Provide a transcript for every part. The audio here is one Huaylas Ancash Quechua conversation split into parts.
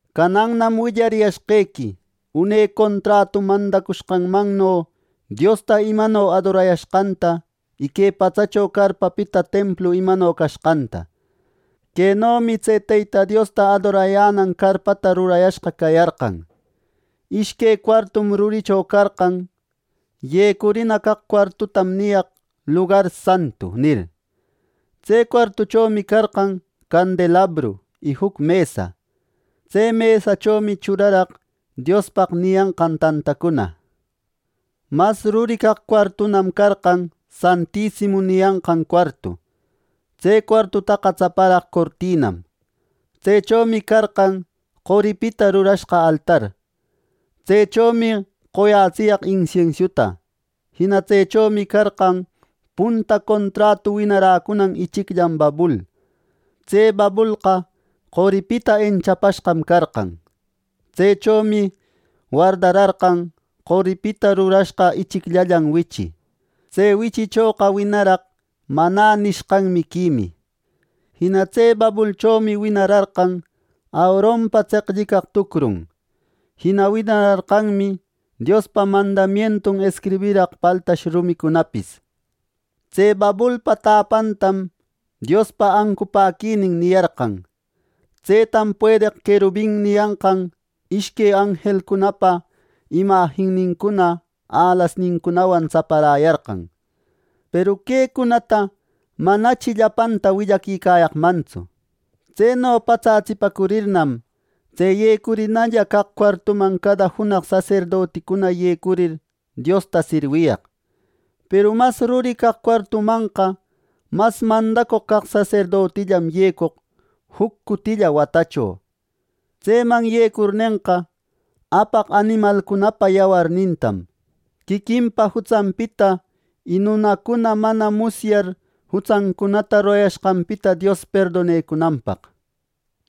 Canannam willariyashqequi une contratu mandacushqanmanno Diosta imano adorayashqanta, y que patsacho carpapita templu imano cashqanta. Quenomi tse Teyta Diosta adorayänan carpata rurayashqa cayarqan: Ishque cuartum ruricho carqan. Yecurina caq cuartutam niyaq “Lugar Santu” nir. Tse cuartuchomi carqan candelabro y juc mesa. Tse mesachomi churaraq “Diospaq” niyanqan tantacuna. Mas ruri caq cuartunam carqan “Santisimu” niyanqan cuartu. Tse cuartutaqa tsaparaq cortinam. Tsechomi carqan qoripita rurashqa altar. Tsechomi qoyatsiyaq insiensiuta. Jina tsechomi carqan punta contratu winaräcunan ichicllan babul. Tse babulqa qoripita enchapashqam carqan. Tsechomi wardararqan qoripita rurashqa ichicllallan wichi. Tse wichichoqa winaraq “Manä” nishqan miquimi. Jina tse babulchomi winararqan Aaronpa tseqllicaq tucrun. Jina winararqanmi Diospa mandamientun escribiraq paltash rumicunapis. Tse babulpa täpantam “Diospa ancupäquinin” niyarqan. Tsetam “Puedeq querubin” niyanqan ishque anjelcunapa imajinnincuna, alasnincunawan tsaparäyarqan. Peru quecunata manachi llapantaqa willaquicayaqmantsu. Tseno patsatsipacurirnam, tse yecurinalla caq cuartuman cada junaq saserdoticuna yecurir Diosta sirwiyaq. Peru mas ruri caq cuartumanqa mas mandacoq caq saserdotillam yecoq juc cutilla watacho. Tseman yecurnenqa, apaq animalcunapa yawarnintam, quiquinpa jutsanpita y nunacuna mana musyar jutsacunata rurayashqanpita Dios perdonecunanpaq.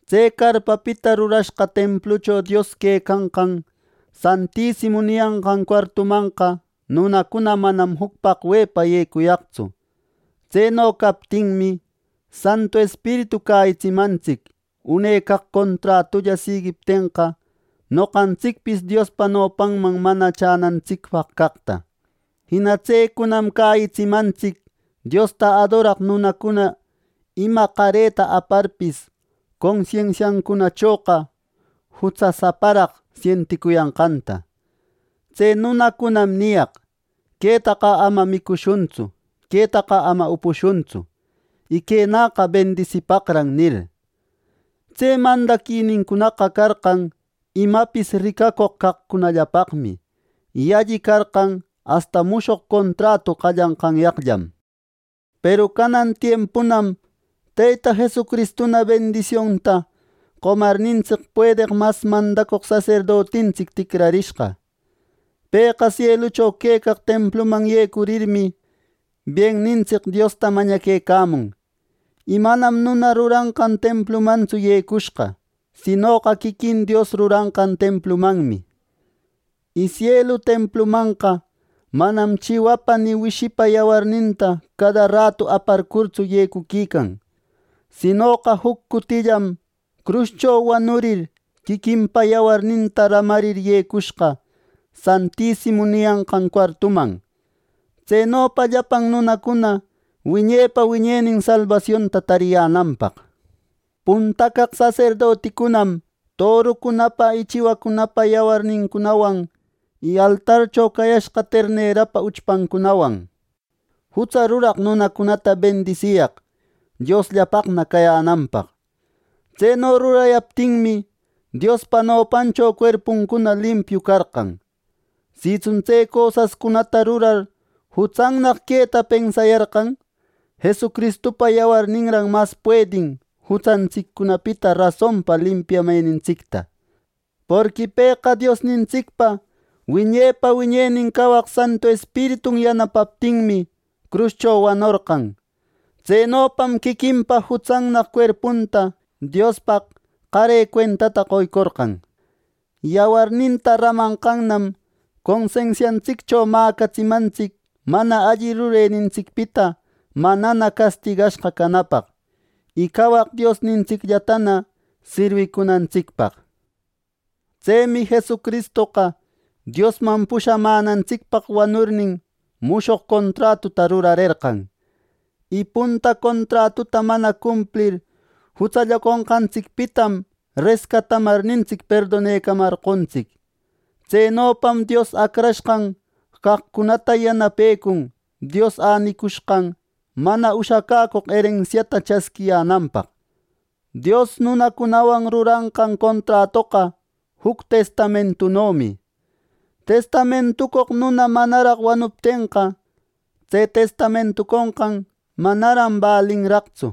Tse carpapita rurashqa templucho Dios quecanan “Santisimu” niyanqan cuartumanqa nunacuna manam juc paqwe yecuyaqtsu. Tseno captinmi, Santu Espiritu cäyitsimantsic une caq contratulla siguiptenqa, noqantsicpis Diospa nopanman mana chänantsicpaq caqta. Jina tsecunam cäyitsimantsic Diosta adoraq nunacuna ima qareta aparpis, consensiancunachoqa jutsasaparaq sienticuyanqanta. Tse nunacunam niyaq: “¡Quetaqa ama micushuntsu; quetaqa ama upushuntsu; y quenäqa bendisipaqran!” nir. Tse mandaquicunaqa carqan imapis ricacoq caqcunallapaqmi, y alli carqan asta mushoq contratu qallanqanyaqllam. Peru canan tiempunam Teyta Jesucristuna bendisionta qomarnintsic puedeq mas mandacoq saserdotintsic ticrarishqa. Pëqa sielucho quecaq templuman yecurirmi, biennintsic Diosta mañaquecamun. Y manam nuna ruranqan templumantsu yecushqa, sinoqa quiquin Dios ruranqan templumanmi. Y sielu templumanqa manam chiwapa ni wishipa yawarninta cada ratu aparcurtsu yecuquican; sinoqa juc cutillam cruscho wanurir, quiquinpa yawarninta ramarir yecushqa “Santisimu” niyanqan cuartuman; tsenopa llapan nunacuna wiñepa wiñenin salbasionta tariyänanpaq. Punta caq saserdoticunam torucunapa y chiwacunapa yawarnincunawan, y altarcho cayashqa ternerapa uchpancunawan jutsa ruraq nunacunata bendisiyaq Diosllapaqna cayänanpaq. Tseno rurayaptinmi, Diospa nopancho cuerpuncuna limpiu carqan. Sitsun tse cosascunata rurar jutsannaq queta pensayarqan, Jesucristupa yawarninran mas puedin jutsantsiccunapita rasonpa limpiamenintsicta. Porqui pëqa Diosnintsicpa wiñepa wiñenin cawaq Santu Espiritun yanapaptinmi, cruscho wanorqa; tsenopam quiquinpa jutsannaq cuerpunta Diospaq qare cuentata qoycorqan. Yawarninta ramanqannam consensiantsiccho mäcatsimantsic mana alli rurenintsicpita manana castigashqa canapaq, y cawaq Diosnintsicllatana sirwicunantsicpaq. Tsemi Jesucristoqa Diosman pushamänantsicpaq wanurnin, mushoq contratuta rurarerqan. Y punta contratuta mana cumplir jutsallaconqantsicpitam rescatamarnintsic perdonecamarqontsic. Tsenopam Dios acrashqan caqcunata yanapecun Dios änicushqan mana ushacäcoq erensiata chasquiyänanpaq. Dios nunacunawan ruranqan contratoqa juc testamentunomi. Testamentucoq nuna manaraq wanuptenqa, tse testamentuconqan manaran balinraqtsu.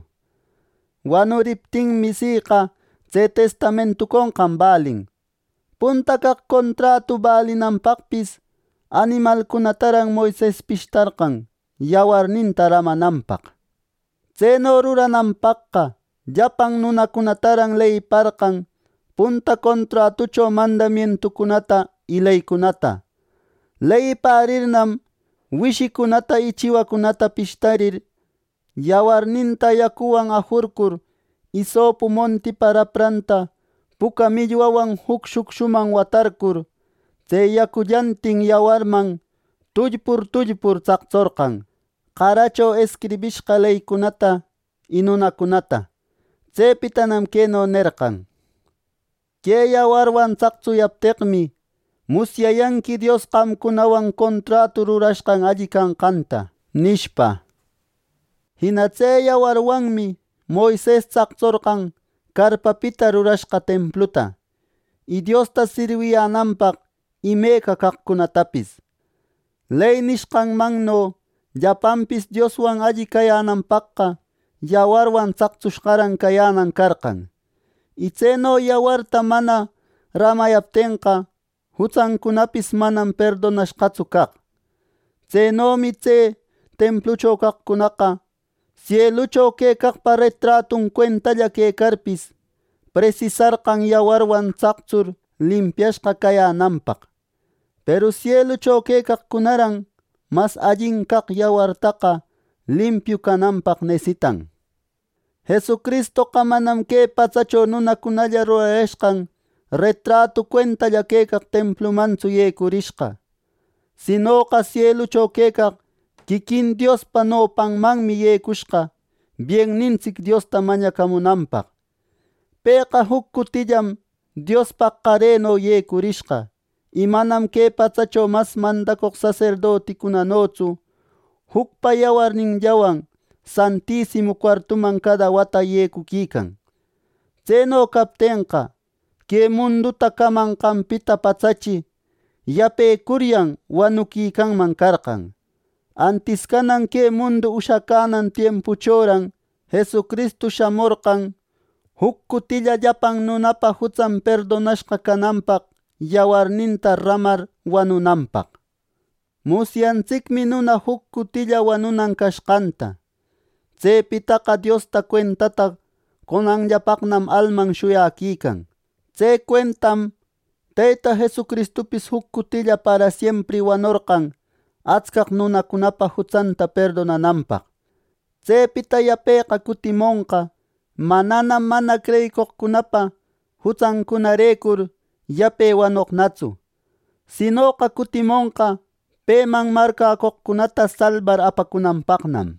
Wanuriptinmi, siqa tse testamentuconqan balin. Punta caq contratu balinanpaqpis animalcunataran Moises pishtarqan yawarninta ramananpaq. Tseno rurananpaqqa llapan nunacunataran leyiparqan punta contratucho mandamientucunata y leycunata. Leyipärirnam wishicunata y chiwacunata pishtarir, yawarninta yacuwan ajurcur isopu montipa rapranta puca millwawan juc shucshuman watarcur, tse yacullantin yawarman tullpur tullpur tsaqtsorqan qaracho escribishqa leycunata y nunacunata. Tsepitanam queno nerqan: “Que yawarwan tsaqtsuyapteqmi, musyayanqui Dios qamcunawan contratu rurashqan alli canqanta” nishpa. Jina tse yawarwanmi Moises tsaqtsorqan carpapita rurashqa templuta, y Diosta sirwiyänanpaq imeca caqcunatapis. Ley nishqanmanno llapanpis Dioswan alli cayänanpaqqa yawarwan tsaqtsushqaran cayänan carqan; y tseno yawarta mana ramayaptenqa, jutsancunapis manam perdonashqatsu caq. Tsenomi tse templucho caqcunaqa, sielucho quecaqpa retratun cuentalla quecarpis, presisarqan yawarwan tsactsur limpiashqa cayänanpaq. Peru sielucho quecaqcunaran mas allin caq yawartaqa limpiu cananpaq nesitan. Jesucristoqa manam que patsacho nunacunalla rurayashqan retratu cuentalla quecaq templumantsu yecurishqa; sinoqa sielucho quecaq quiquin Diospa nopanmanmi yecushqa biennintsic Diosta mañacamunanpaq. Pëqa juc cutillam Diospaq qareno yecurishqa; y manam que patsacho mas mandacoq saserdoticunanotsu jucpa yawarninllawan “Santisimu” cuartuman cada wata yecuquican. Tseno captenqa, que munduta camanqanpita patsachi yapecuryan wanuquicanman carqan. Antis canan que mundu ushacänan tiempuchoran Jesucristu shamorqan juc cutilla llapan nunapa jutsan perdonashqa cananpaq yawarninta ramar wanunanpaq. Musyantsicmi nuna juc cutilla wanunan cashqanta. Tsepitaqa Diosta cuentata qonanllapaqnam alman shuyaquican. Tse cuentam Teyta Jesucristupis juc cutilla parasiempri wanorqan atscaq nunacunapa jutsanta perdonananpaq. Tsepita yapeqa cutimonqa, mananam mana creyeqcunapa jutsancunarecur yape wanoqnatsu; sinoqa cutimonqa peman marcäcoqcunata salbar apacunanpaqnam.